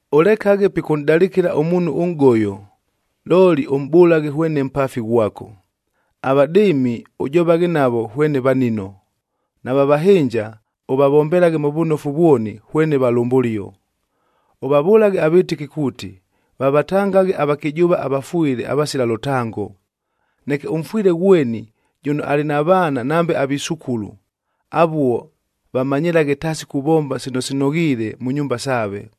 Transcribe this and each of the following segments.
Ʉlekaghe pikʉnʼdalɨkɨla ʉmuunhu ʉnʼgoyo, looli ʉmʼbʉlaghe hwene mpaafi ghwako. Avadɨɨmi ʉjovaghe navo hwene vanino. Nava vahɨnja, ʉvavombelaghe mʉ vʉnofu vwoni hwene valʉmbʉlio. Ʉvavʉlaghe avɨtɨki kuuti, vavatangaghe avakɨjʉʉva avafwɨle avasila lʉtango. Neke ʉmfwɨle ghweni jʉno alɨ na vaana nambe avisukulu, avuo vamanyɨlaghe taasi kuvomba sino sinoghiile mʉ nyumba saave.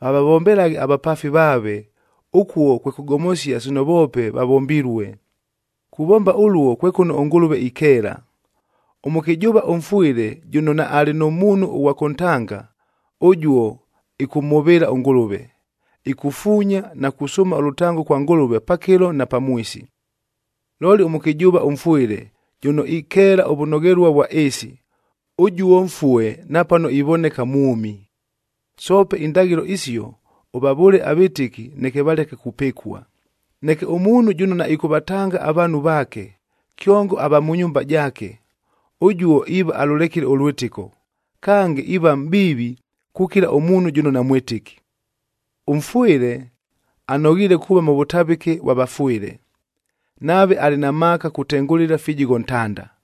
Vavavombelaghe avapaafi vaave, ʉkuo kwe kʉgomosia sino voope vavombilue. Kuvomba ʉluo kwe kʉno ʉNgʉlʉve ikeela. Ʉmʉkɨjʉʉva ʉmfwɨle jʉno naalɨ nʉ muunhu ʉghwa kʉntanga, ʉjuo ɨkʉmhʉvɨɨla ʉNgʉlʉve, ikufuunya na kusʉʉma ʉlʉtango kwa Ngʉlʉve pakɨlo na pamwisi. Looli ʉmʉkɨjʉʉva ʉmfwɨle jʉno ikeela ʉvʉnoghelua vwa ɨɨsi, ʉjuo mfue napano ivoneka mwʉmi. Soope indaghɨlo isio ʉvavʉʉle avɨtɨki neke valeke kupɨkua. Neke ʉmuunhu jʉno naɨkʉvatanga avaanhu vaake, kyongo ava mʉ nyumba jaake, ʉjuo iiva alʉlekile ʉlwɨtɨko, kange iiva mʼbiivi kukila ʉmuunhu jʉno namwɨtɨki. Ʉmfwɨle anoghiile kuuva mʉ vʉtavɨke vwa vafwɨle, nave alɨ na maaka kutengʉlɨla ifijigho ntanda,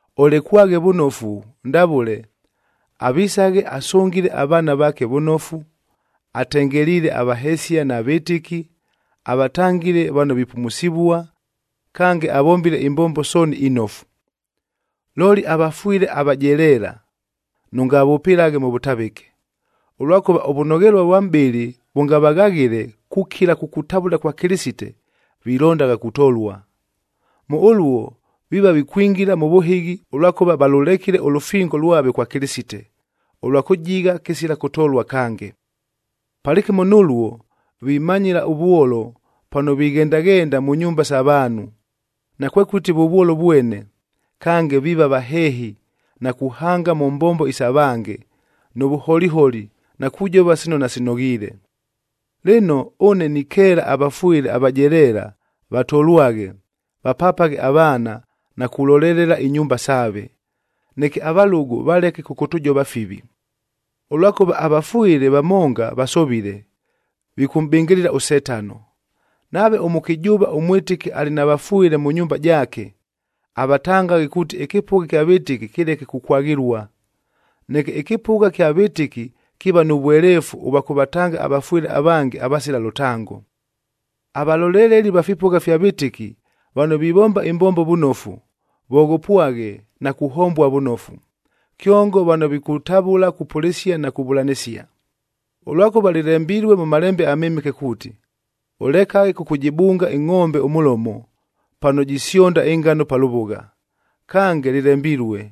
Olekwaghe vʉnofu, ndavʉle: avisaghe asʉngile avaana vaake vʉnofu, atengeliile avahesia na vɨtɨki, avatangile vano vipumusivua, kange avombile imbombo sooni inofu. Looli avafwɨle avajeleela, nʉngavʉpɨlaghe mʉ vʉtavɨke, ʉlwakʉva ʉvʉnoghelua vwa mʼbɨlɨ vʉngavaghaghɨle kukila kukutavʉla kwa Kɨlɨsite, vilondagha kutolua. Mʉ ʉluo viiva vikwingila mʉ vʉhɨghi, ʉlwakʉva valʉlekile ʉlʉfingo lwave kwa Kɨlɨsite, ʉlwa kʉjigha kɨsila kʉtolua kange. Palɨkɨmo nʉluo, vimanyɨla ʉvwolo pano vighendaghenda mʉ nyumba isa vaanhu. Nakwekʉti vʉvwolo vwene, kange viiva vaheehi na kuhanga mʉ mbombo isa vange, nʉ vʉholiholi na kujova sino nasinoghiile. Lɨno, ʉne nikeela avafwɨle avajeleela, vatolwaghe, vapapaghe avaana na kulolelela inyumba saave, neke avalʉgʉ valeke kʉkʉtʉjova fivi. Ʉlwakʉva avafwɨle vamonga vasovile, vikʉmʼbɨngɨlɨla ʉSetano. Nave ʉmʉkɨjʉʉva ʉmwɨtɨki alɨ na vafwɨle mʉ nyumba jaake, avatangaghe kuuti ɨkɨpʉgha kya vɨtɨki kɨleke kukwaghɨlua. Neke ɨkɨpʉgha kya vɨtɨki kiiva nʉ vweleefu ʉvwa kʉvatanga avafwɨle avange avasila lʉtango. Avaloleleli va fipʉgha fya vɨtɨki, vano vivomba ɨmbombo vʉnofu, voghopwaghe na kuhombua vʉnofu,b kyongo vano vikutavʉla kupʉlɨsia na kuvʉlanɨsia. Ʉlwakʉva lɨlembilue mʉ Malembe aMɨmɨke kuuti, “Ʉlekaghe kʉkʉjɨbunga ɨngʼombe ʉmʉlomo, pano jisyonda ɨngano pa lʉvʉgha.”c Kange lɨlembilue,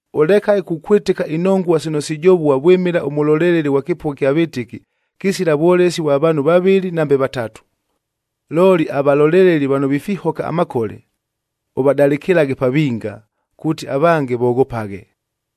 Ʉlekaghe kukwɨtɨka inongua sino sijovua vwɨmɨla ʉmʉloleleli ghwa kɨpʉgha ɨkya vɨtɨki, kɨsila vwolesi vwa vaanhu vavɨlɨ nambe vatatu. Looli avaloleleli vano vifihoka amakole, ʉvadalɨkɨlaghe pa vinga, kuuti avange voghopaghe.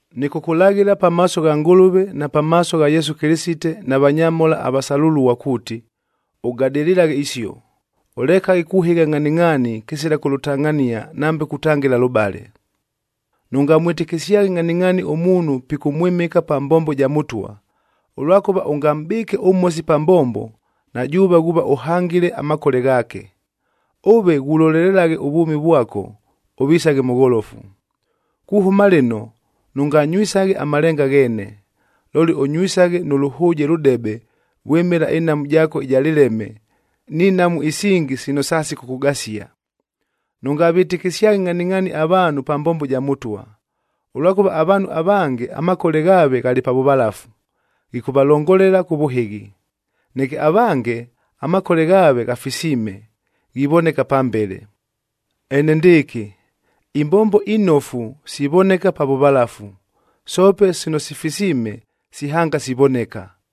Nɨkʉkʉlaghɨla pamaaso gha Ngʉlʉve, na pamaaso gha Yesu Kɨlɨsite na vanyamhola avasalʉlua kuuti, ʉgadɨlɨlaghe isio, ʉlekaghe kuhɨgha ngʼhaningʼhaani kɨsila kʉlʉtangʼhania nambe kutangɨla lʉbale. Nʉngamwɨtɨkɨsyaghe ngʼhaningʼhaani ʉmuunhu pikʉmwɨmɨka pa mbombo ja Mʉtwa, ʉlwakʉva ʉngamʼbɨɨke ʉmhosi pa mbombo, na jʉʉve ghuuva ʉhangile amakole ghaake. Ʉve ghulolelelaghe ʉvwʉmi vwako, ʉvisaghe mʉgholofu. Kuhʉma lɨno, nʉnganywisaghe amalenga gheene, looli ʉnywisaghe nʉ lʉhʉʉjee lʉdebe vwɨmɨla ɨnhamu jaako ɨja lɨleme ni nhamu isingi sino sasikʉkʉgasia. Nʉngavɨtɨkɨsyaghe ngʼhaningʼhaani avaanhu pa mbombo ja Mʉtwa, ʉlwakʉva avaanhu avange, amakole ghaave ghalɨ pa vʉvalafu, ghikʉvalongolela kʉ vʉhɨghi. Neke avange, amakole ghaave ghafisiime, ghivoneka pambele. Enendɨɨkɨ, imbombo inofu sivoneka pa vʉvalafu, soope sino sifisiime sihanga sivoneka.